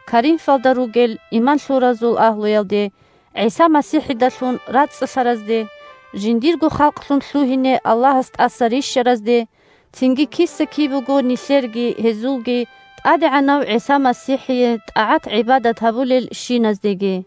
Коринфалда ругел иман лъуразул агьлуялде – ГӀиса МасихӀидалъун рацӀцӀалъаразде, жиндирго халкълъун лъугьине Аллагьас тӀаса рищаразде, цинги киса-кибего нилъерги гьезулги ТӀадегӀанав ГӀиса МасихӀие тӀагӀат-гӀибадат гьабулелщиназдеги.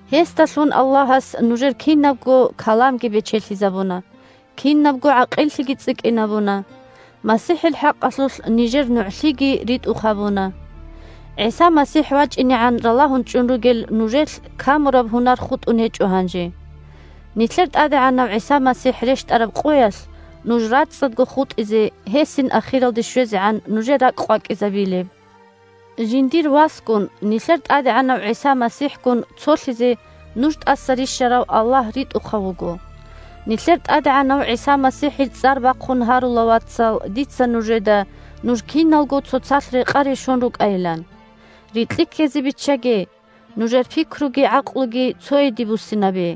Гьесдалъун Аллагьас нужер кинабго каламги бечелъизабуна, кинабго гӀакъиллъиги цӀикӀкӀинабуна, МасихӀил хӀакъалъулъ нижер нугӀлъиги ритӀухъ гьабуна. ГӀиса МасихӀ вачӀинегӀан ралагьун чӀун ругел нужелъ камураб гьунар хутӀун гьечӀо гьанже. Нилъер ТӀадегӀанав ГӀиса МасихӀ рещтӀараб къоялъ нуж рацӀцӀадго хутӀизе гьесин ахиралде щвезегӀан нужер ракӀкъвакӀизабилеб. Жиндирго Васгун – нилъер ТӀадегӀанав ГӀиса МасихӀгун – цолъизе нуж тӀаса рищарав Аллагь ритӀухъав вуго. Нилъер ТӀадегӀанав ГӀиса МасихӀил цӀар бахъун гьарула, вацал, дица нужеда, нуж киналго цоцалъ рекъа-решон рукӀайилан. Рикьи ккезе биччаге – нужер пикруги гӀакълуги цойиде буссинабе!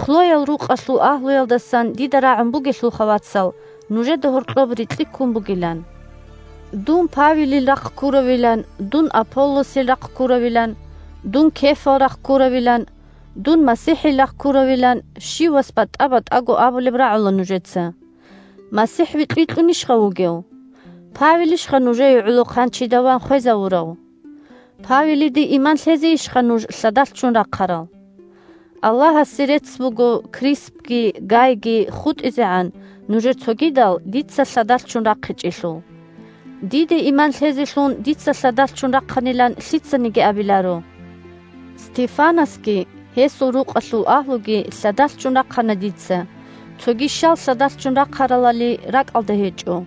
Хлоял рукъалъул агьлуялдасан дида рагӀун бугелъулха, вацал, нужеда гьоркьоб рикьи ккун бугилан. «Дун Павелил рахъ ккуравилан», «дун Аполлосил рахъ ккуравилан», «дун Кефал рахъ ккуравилан», «дун МасихӀил рахъ ккуравилан» – щивас батӀа-батӀаго абулеб рагӀула нужеца. МасихӀ викь-викьунищха вугев?! Павелищха нужее гӀоло хъанчида ван хвезавурав? Павелиде иман лъезейищха нуж лъадалъ ччун рахъарал? Аллагьасе рецц буго, Криспги Гайги хутӀизегӀан, нужер цогидал дица лъадалъ ччун рахъичӀелъул. Диде иман лъезелъун дица лъадалъ ччун рахъанилан лъицаниги абиларо. (Стефанасги гьесул рукъалъул агьлуги лъадалъ ччун рахъана дица, цоги щал лъадалъ ччун рахъаралали ракӀалда гьечӀо.)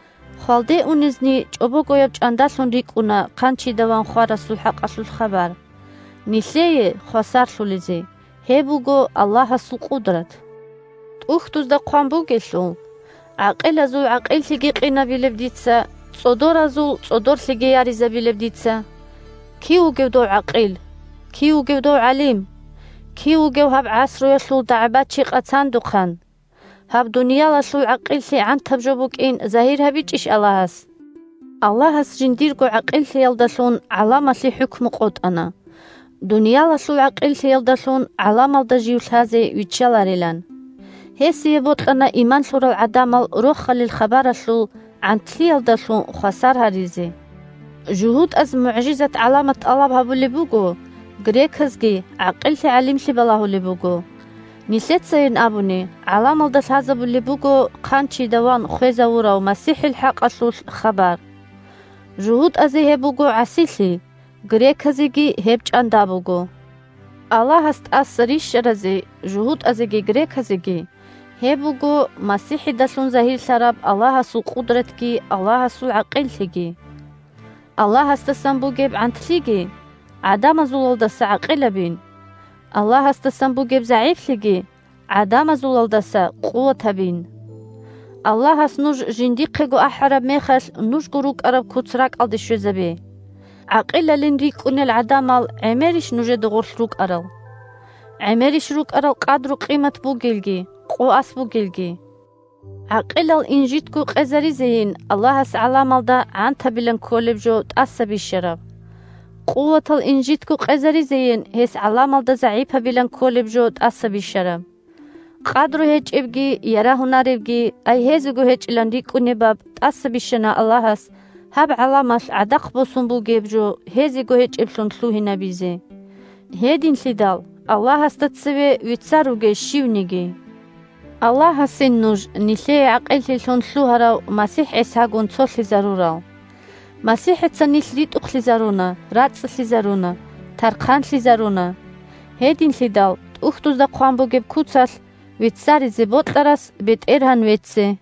Хвалде унезни чӀобогояб чӀандалъун рикӀкӀуна хъанчида ван хварасул хӀакъалъулъ хабар. Нилъее – хвасарлъулезе – гьеб буго Аллагьасул къудрат. ТӀухьдузда хъван бугелъул: «ГӀакъилазул гӀакъиллъиги къинабилеб Дица, ЦӀодоразул цӀодорлъиги яризабилеб Дица». Кив вугев дов гӀакъил? Кив вугев дов гӀалим? Кив вугев гьаб гӀасруялъул дагӀбачи-къацандухъан? Гьаб дуниялалъул гӀакъиллъи гӀантаб жо букӀин загьир гьабичӀищ Аллагьас? Аллагьас жиндирго гӀакъиллъиялдалъун гӀаламалъе хӀукму къотӀана, дуниялалъул гӀакъиллъиялдалъун гӀаламалда Жив лъазе виччаларилан. Гьесие бокьана иман лъурал гӀадамал Рохалил хабаралъул «гӀантлъиялдалъун» хвасар гьаризе. ЖугьутӀаз мугӀжизат-гӀаламат тӀалаб гьабулеб буго, греказги гӀакъиллъи-гӀалимлъи балагьулеб буго. Нилъецайин абуни гӀаламалда лъазабулеб буго хъанчида ван хвезавурав МасихӀил хӀакъалъулъ хабар. ЖугьутӀазе гьеб буго гӀасилъи, греказеги гьеб чӀанда буго! Аллагьас тӀаса рищаразе – жугьутӀазеги греказеги – гьеб буго МасихӀидалъун загьирлъараб Аллагьасул къудратги Аллагьасул гӀакъиллъиги! Аллагьасдасан бугеб «гӀантлъиги» гӀадамазулалдаса гӀакъилабин, Аллагьасдасан бугеб «загӀиплъиги» гӀадамазулалдаса къуватабин! Аллагьас нуж жиндихъего ахӀараб мехалъ нужго рукӀараб куц ракӀалде щвезабе. ГӀакъилалин рикӀкӀунел гӀадамал гӀемерищ нужеда гъорлъ рукӀарал? ГӀемерищ рукӀарал къадру-къимат бугелги къо-асс бугелги? ГӀакъилал инжитго къезаризейин Аллагьас гӀаламалда гӀантабилан кколеб жо тӀаса бищараб. Къуватал инжитго къезаризейин гьес гӀаламалда загӀипабилан кколеб жо тӀаса бищараб. Къадру гьечӀебги ярагьунаребги, ай гьезего гьечӀилан рикӀкӀунебаб тӀаса бищана Аллагьас, гьаб гӀаламалъ гӀадахъ босун бугеб жо гьезего гьечӀеблъун лъугьинабизе. Гьединлъидал Аллагьасда цеве веццаруге щивниги. Аллагьасин нуж нилъее гӀакъиллъилъун лъугьарав МасихӀ ГӀисагун цолъизарурал. МасихӀица нилъ ритӀухълъизаруна, рацӀцӀалъизаруна, тархъанлъизаруна. Гьединлъидал, ТӀухьдузда хъван бугеб куцалъ: «Веццаризе бокьарас БетӀергьан вецце!»